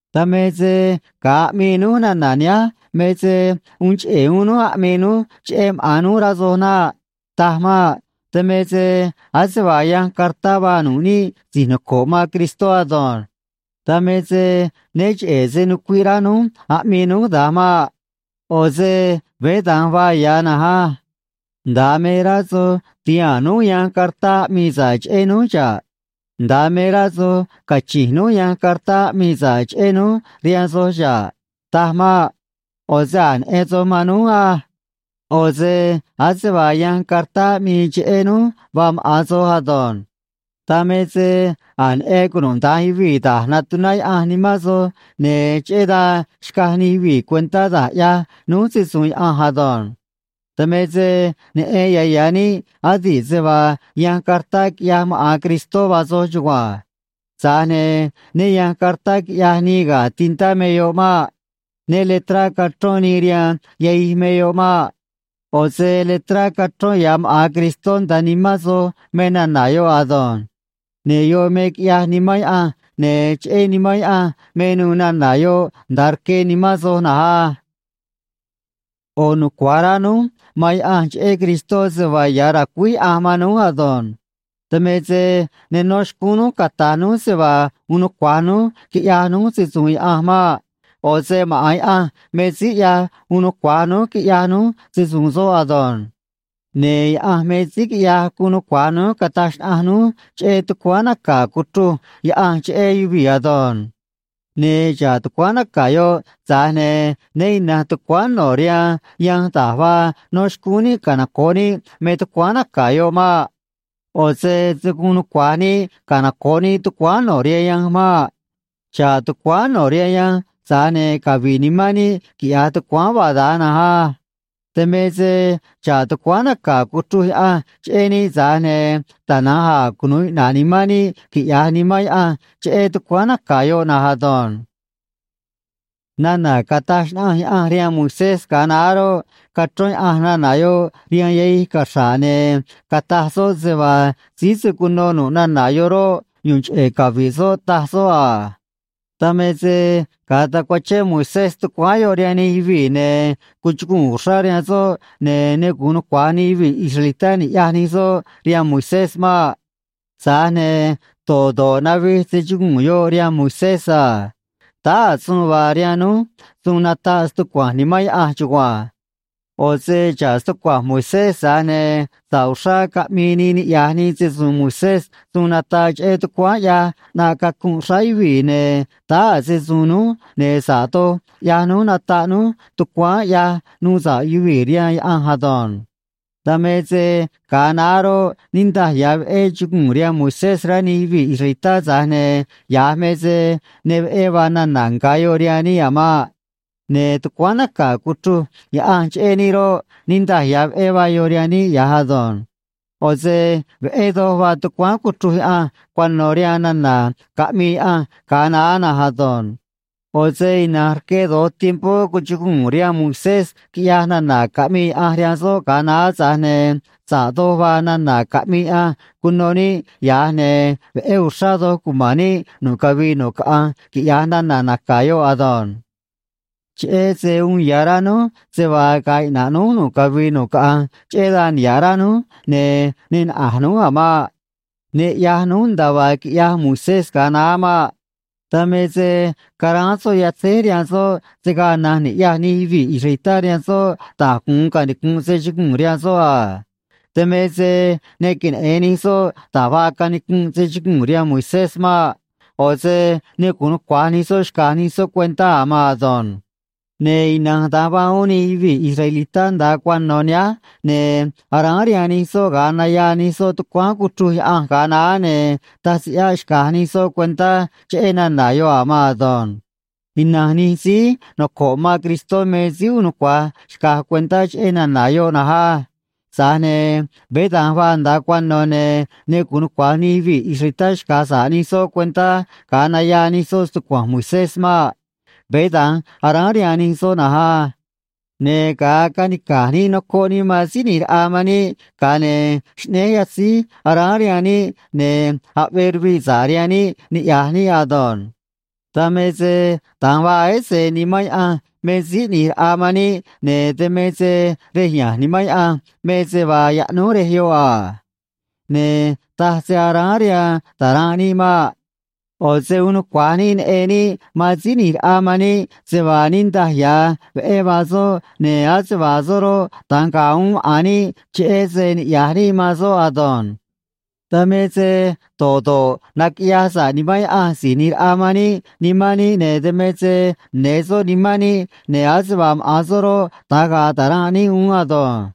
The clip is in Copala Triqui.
Dan me se ga̱a aꞌmii núj nana̱ nihánj me se uun cheꞌe̱ uún núj aꞌmii núj cheꞌé maꞌa̱n núj, rá soj naꞌ. Taj maꞌ. Dan me se ase vaa yanj cartá vaa nu̱ꞌ níꞌ si̱j noco̱ꞌ man Cristó ado̱nj. Dan me se né cheꞌe̱ se nucuiꞌ rá núj aꞌmii núj da̱nj maꞌ. ꞌO̱ se veé da̱nj vaa ya̱ na̱nj á. Nda̱a me rá soj ti̱haa̱n núj yanj cartá aꞌmii sa̱ꞌ cheꞌé núj xa̱ꞌ. Nda̱a me rá soj cachi̱nj núj yanj cartá aꞌmii sa̱ꞌ cheꞌé núj rihaan soj xa̱ꞌ. Taj maꞌ. ꞌO̱ se a̱j neꞌen soj man núj á. ꞌO̱ se ase vaa yanj cartá aꞌmii cheꞌé núj vaa maꞌa̱n soj ado̱nj. Dan me se a̱j neꞌen cunuda̱nj yuvii̱ da̱j natuná Yaꞌanj nimán soj, ne̱ cheꞌé dan xcaj nij yuvii̱ cuentá da̱j ꞌyaj núj se‑su̱u̱n Yaꞌanj ado̱nj. Dan me se neꞌen ya̱ ya̱ níꞌ adi̱ꞌ se vaa yanj cartá quiꞌyaj maꞌa̱n Cristó vaa soj chugua̱nj. Tza̱j ne̱ né ya̱nj cartá quiꞌyaj nii ga̱ tintá me yoꞌ maꞌ. Né le̱trá cachrón nii rihaan yahij me yoꞌ maꞌ. ꞌO̱ se letrá cachrón ya̱ maꞌa̱n Cristó nda̱a nimán soj me nana̱ yoꞌ ado̱nj. Ne̱ yoꞌ me quiꞌyaj Nimán Yaꞌanj, ne̱ cheꞌé Nimán Yaꞌanj me nuû nana̱ yoꞌ nda̱a rque nimán soj na̱nj á. ꞌO̱ nucua̱j rá núj man Yaꞌanj cheꞌé Cristó se vaa ya̱ racuíj Yaꞌanj man núj ado̱nj. Dan me se ne nó xcúún núj cata̱j núj se vaa uun nucua̱j núj quiꞌya̱j núj se‑su̱u̱n Yaꞌanj maꞌ. ꞌO̱ se maꞌa̱n Yaꞌanj me síí ꞌyaj uun nucua̱j núj quiꞌya̱j núj se‑su̱u̱n soꞌ ado̱nj. Ne̱ Yaꞌanj me síí quiꞌyaj guun nucua̱j núj cataj xnaꞌanj núj cheꞌé tucuáán naca̱ cuchruj Yaꞌanj cheꞌé yuvii̱ ado̱nj. Ne̱ xa̱ꞌ tucuáán naca̱ yoꞌ, tza̱j ne̱ né ina̱nj tucuáán no̱ rihaan yanj da̱j vaa no̱ xcúún níꞌ canoco̱ꞌ níꞌ me tucuáán naca̱ yoꞌ maꞌ. ꞌO̱ se se̱ guun nucua̱j níꞌ canoco̱ꞌ níꞌ tucuáán no̱ rihaan yanj maꞌ. Xa̱ꞌ tucuáán no̱ rihaan yanj, tza̱j ne̱ cavi̱ꞌ nimán níꞌ, quiꞌya̱j tucuáán vaa da̱nj na̱nj á. Dan me se xa̱ꞌ tucuáán naca̱ cuchruj Yaꞌanj cheꞌé níꞌ, tza̱j ne̱ tana̱nj a̱ cunu̱u iꞌna̱ꞌ nimán níꞌ quiꞌya̱j Nimán Yaꞌanj cheꞌé tucuáán naca̱ yoꞌ na̱nj ado̱nj. Nana̱ cataj xnaꞌanj Yaꞌanj rihaan Moisés ga̱a naá roꞌ, cachrón Yaꞌanj nana̱ yoꞌ rihaan yahij caxra̱ꞌ, ne̱ cataj soꞌ se vaa síí se̱ cuno nu̱ꞌ nana̱ yoꞌ roꞌ, yu̱u̱n cheꞌe̱ cavi̱ꞌ soꞌ, taj soꞌ a. Dan me se ga̱a tacuachén Moisés tucuáán yoꞌ rihaan nij yuvii̱, ne̱ cuchuguu̱n uxrá rihaan soꞌ, ne̱ ne gu̱un nucua̱j nij yuvii̱ israelitá ni̱ꞌyaj nij soꞌ rihaan Moisés maꞌ. Tza̱j ne̱ do̱ꞌ do̱ꞌ navij se chuguu̱n yoꞌ rihaan Moisés a. Táá a̱ suun vaa rihaan núj suun nataꞌ stucua̱nj Nimán Yaꞌanj chugua̱nj. ꞌO̱ se xa̱ꞌ stucua̱nj Moisés, tza̱j ne̱ sa̱ꞌ uxrá caꞌmii nii niꞌya̱j nii se‑su̱u̱n Moisés suun nataꞌ cheꞌé tucuáán ꞌyaj ꞌnaꞌ cacunꞌ xráá yuvii̱, ne̱ táá a̱ se‑su̱u̱n núj, ne̱ sa̱ꞌ doj ꞌyaj núj nataꞌ núj tucuáán ꞌyaj nuu sa̱ꞌ yuvii̱ rihaan Yaꞌanj ado̱nj. Dan me se ga̱a naá roꞌ, niꞌndaj ya̱ veꞌé chuguu̱n rihaan Moisés, rá nij yuvii̱ israelitá, tza̱j ne̱ ya̱j me se ne veꞌé vaa nana̱ nga̱ yoꞌ rihaan níꞌ a̱ maꞌ. Ne̱ tucuáán naca̱ cuchruj Yaꞌanj cheꞌé níꞌ roꞌ, niꞌndaj ya̱ veꞌé vaa yoꞌ rihaan níꞌ ya̱j ado̱nj. ꞌO̱ se veꞌé doj vaa tucuáán cuchruj Yaꞌanj cuano̱ rihaan nana̱ caꞌmii Yaꞌanj ga̱a naá na̱nj ado̱nj. ꞌO̱ se ina̱nj rque do̱j tiempó cuchuguu̱n rihaan Moisés, quiꞌyaj nana̱ caꞌmii Yaꞌanj rihaan soꞌ ga̱a naá, tza̱j ne̱ sa̱ꞌ doj vaa nana̱ caꞌmii Yaꞌanj cuno níꞌ ya̱j, ne̱ veꞌé uxrá doj cuma̱n níꞌ nu̱ꞌ cavii nu̱ꞌ caꞌanj, quiꞌya̱j nana̱ naca̱ yoꞌ ado̱nj. Cheꞌé se uun ya̱ rá núj se vaa ga̱a̱ iꞌna̱ꞌ núj nu̱ꞌ cavii nu̱ꞌ caꞌanj, cheꞌé dan niha̱ꞌ rá núj, ne̱ ne naꞌa̱j núj a̱ maꞌ. Ne ꞌyaj núj nda̱a vaa quiꞌyaj Moisés ga̱a naá maꞌ. Dan me se caráán soꞌ yatzéj rihaan soꞌ, se̱ gaa na̱nj ni̱ꞌyaj nij yuvii̱ israelitá rihaan soꞌ da̱j gu̱un canicunꞌ se chuguu̱n rihaan soꞌ a. Dan me se ne queneꞌe̱n nij soꞌ da̱j vaa canicunꞌ se chuguu̱n rihaan Moisés maꞌ. ꞌO̱ se ne gu̱un nucua̱j nij soꞌ xca̱j nij soꞌ cuentá a̱ maan ado̱nj. Ne̱ ina̱nj da̱nj vaa uún nij yuvii̱ israelitá nda̱a cuano̱ nihánj, ne̱ aráán rihaan nij soꞌ ga̱a nayaa nij soꞌ tucuáán cuchruj Yaꞌanj ga̱a naá, ne̱ taj se ꞌyáꞌ xca̱j nij soꞌ cuentá cheꞌé nana̱ yoꞌ a̱ maan ado̱nj. Ina̱nj nij síí noco̱ꞌ man Cristó me síí uun nucua̱j xca̱j cuentá cheꞌé nana̱ yoꞌ na̱nj á. Tza̱j ne̱ veé da̱nj vaa nda̱a cuano̱, ne̱ ne gu̱un nucua̱j nij yuvii̱ israelitá xca̱j sa̱ꞌ nij soꞌ cuentá ga̱a nayaa nij soꞌ stucua̱nj Moisés maꞌ. Veé da̱nj aráán rihaan nij soꞌ na̱nj á. Ne̱ ga̱a canica̱j níꞌ nocoꞌ níꞌ man Síí ꞌNi̱j Raꞌa man níꞌ, ga̱a ne̱ xꞌnéj yatzíj aráán rihaan níꞌ, ne̱ aꞌvee ruviꞌ sa̱ꞌ rihaan níꞌ niꞌya̱j níꞌ ado̱nj. Dan me se da̱nj vaa ese Nimán Yaꞌanj me Síí ꞌNi̱j Raꞌa man níꞌ, ne̱ dan me se rej ya̱nj Nimán Yaꞌanj me se vaa yaꞌnúj rej yoꞌ a. Ne̱ taj se aráán rihaan ta̱ranꞌ níꞌ maꞌ. ꞌO̱ se uun nucua̱j níꞌ neꞌen níꞌ man Síí ꞌNi̱j Raꞌa man níꞌ, se vaa niꞌndaj ya̱ veꞌé vaa soꞌ, ne̱ ase vaa soꞌ roꞌ, da̱nj ga̱a̱ uún maꞌa̱n níꞌ, cheꞌé se niꞌya̱j níꞌ man soꞌ ado̱nj. Dan me se do̱ꞌ do̱ꞌ naquiꞌyaj sa̱ꞌ Nimán Yaꞌanj Si̱j ꞌNi̱j Raꞌa man níꞌ nimán níꞌ, ne̱ dan me se ne̱ soꞌ nimán níꞌ, ne̱ ase vaa maꞌa̱n soꞌ roꞌ, da̱nj ga̱a̱ ta̱ranꞌ níꞌ uún ado̱nj.